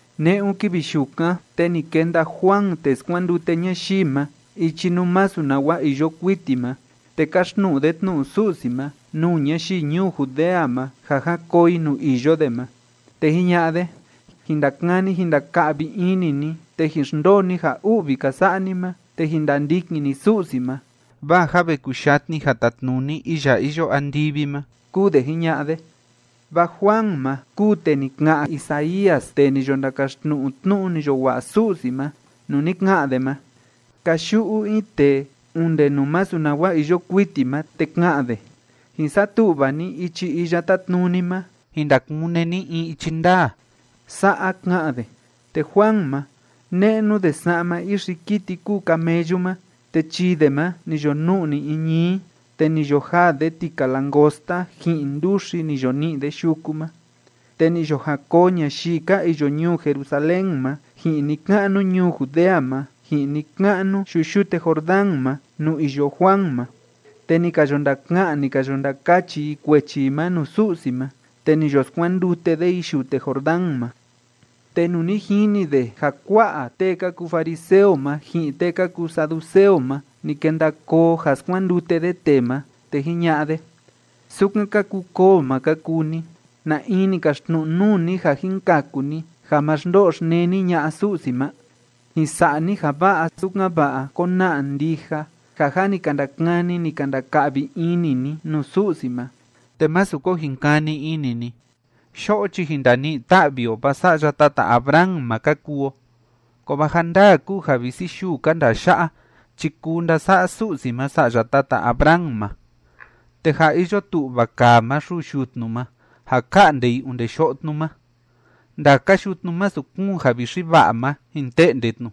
Ne'un kivi yukan, te ni kenda Juan tee skuandute ñayii ma ichi nuu masu nawa iyo kuiti ma, te káxtnu'u de tnu'u Su'si ma nuu ñayii ñuu Judea ma ja jan koo i nuu iyo de ma. Te jiña'a de: ―Jin ndakani jin ndaka'vi ini ni, te jin xndoo ni ja u'vi ka sa'a ni ma, te jin ndandikin ni Su'si ma, vaa jâ ve kuyatni ja tatnuni iya iyo andivi ma ―kúu de jiña'a de. Vaa Juan ma kúu tee ni ka'an Isaías tee ni yo ndakaxtnu'u tnu'u ni yo wa'a Su'si ma, nuu ni ka'an de ma: Kayu'u in tee onde nuu masu nawa iyo kuiti ma, te ka'an de: “Jin satu'va ni ichi Iya Tátnuni ma, jin ndakune ni in ichi ndaa.” Sa'a ka'an de. Te Juan ma, ne'nu de sa'ma ixi kiti kúu camellu ma, te chii de ma ni yo nu'ni in ñií. Te ni yo jaa de tika langosta ji'in nduxi ni yo ni'i de yuku ma. Te ni yo jan koo ñayii ka iyo ñuu Jerusalén ma, ji'in ni‑ka'nu ñuu Judea ma, ji'in ni‑ka'nu yuyute Jordán ma nuu iyo Juan ma. Te ni ka yo ndaka'an, ni ka yo ndakachi i kuechi i ma nuu Su'si ma, te ni yo skuandute de i yute Jordán ma. Te nuu ni jini de ja kua'a tee ka kuu fariseo ma ji'in tee ka kuu saduceo ma ni kenda koo ja skuandute de tee ma, te jiña'a de: ―¡Sukan ka kuu koo ma ka kuu ni! ¿Na in ni kaxtnu'u nuu ni ja jin kaku ni ja ma xndo'o xneni ña'a Su'si ma? Jin sa'a ni ja va'a, sukan‑va'a kona'a ndija ja jâ ni ka ndakani, ni ka ndaka'vi ini ni nuu Su'si ma. Te másu ko jin kani ini ni: “¡Yo'o chi jin ndani'i‑ta'vi o, vaa sa'ya tata Abraham ma ka kuu o!” Kovaa ja ndaa kúu ja visi yuu ka ndaa ya'a chi kuu ndasa'a Su'si ma sa'ya tata Abraham ma. Te jâ iyo tu'va kaa ma xuu yutnu ma ja ka'nde i onde yo'o tnu ma. Ndaka yutnu masu kúun javixi va'a ma, jin te'nde tnu,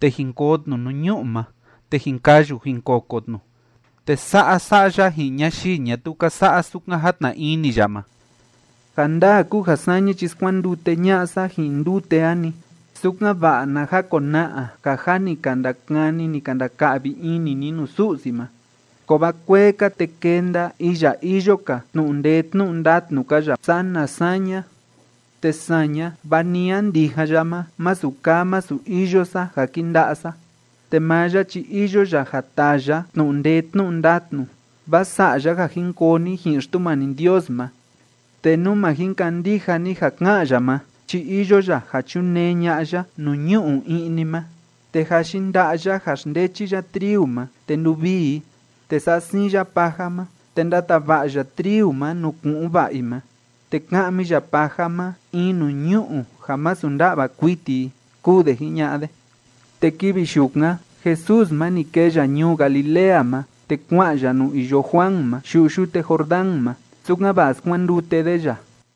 te jin koo tnu nuu ñu'u ma, te jin kayu jin koko tnu. Te sa'a sa'a ya ji'in ñayii ñatuu ka sa'a sukan játna ini ya ma. Ja ndaa kúu ja saña chi skuandute ña'a sa ji'in ndute a‑ni, sukan‑va'a na jakona'a ja jâ ni ka ndakani, ni ka ndaka'vi ini ni nuu Su'si ma. Kovaa kuee‑ka, te kenda iya iyo‑ka tnu'u ndee tnu'u ndatnu‑ka ya sana saña, te saña, va ni a ndijan ya ma masu kaa masu iyo sa ja kinda'a sa. Te maa ya chi iyo ya ja taa ya tnu'u ndee tnu'u ndatnu vaa sa'a ya ja jin koo ni ji'in Xtumani Ndios ma, te nú ma jin kandija ni ja ká'an ya ma chi iyo ya ja chunee ña'a ya nuu ñu'u i'ni ma. Te jâ yinda'a ya ja xndechi ya triu ma te nduvii i, te sa'a siin ya paja ma, te ndatava'a ya triu ma nuu ku'un va'a i ma. Te ka'mi ya paja ma in nuu ñu'u ja masu nda'va kuiti i ―kúu de jiña'a de. Te kivi yukan Jesús ma, ni kee ya ñuu Galilea ma, te kua'an ya nuu iyo Juan ma yuyute Jordán ma, sukan‑va'a skuandute de ya.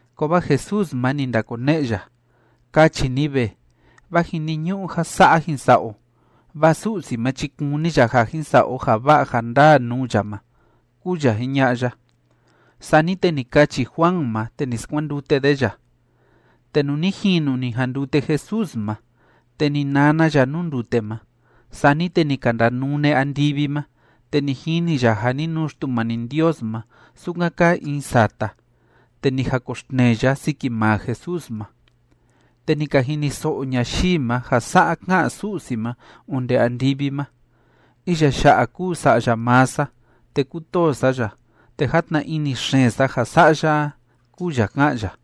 Kovaa Jesús ma, ni ndakone'e ya: ―Kachi ni ve, vaa jiniñu'u ja sa'a jin sa'a o, vaa Su'si ma chi, kúni ya ja jin sa'a o ja va'a ja ndaa nuu ya ma ―kúu ya jiña'a ya. Sani te ni kachi Juan ma, te ni skuandute de ya. Te nuu ni jinu ni jandute Jesús ma, te ni nana ya nuu ndute ma. Sani te ni ka ndanune andivi ma, te ni jini ya ja ni nuu Xtumani Ndios ma sukan kaa in sata, te ni jakoxtnee ya siki maa Jesús ma. Te ni ka jiniso'o ñayii ma ja sa'a ká'an Su'si ma onde andivi ma: ―Iya ya'a kúu Sa'ya maa sa, te kútoo sa ya, te játna ini xeen sa ja sa'a ya a ―kúu ya ká'an ya.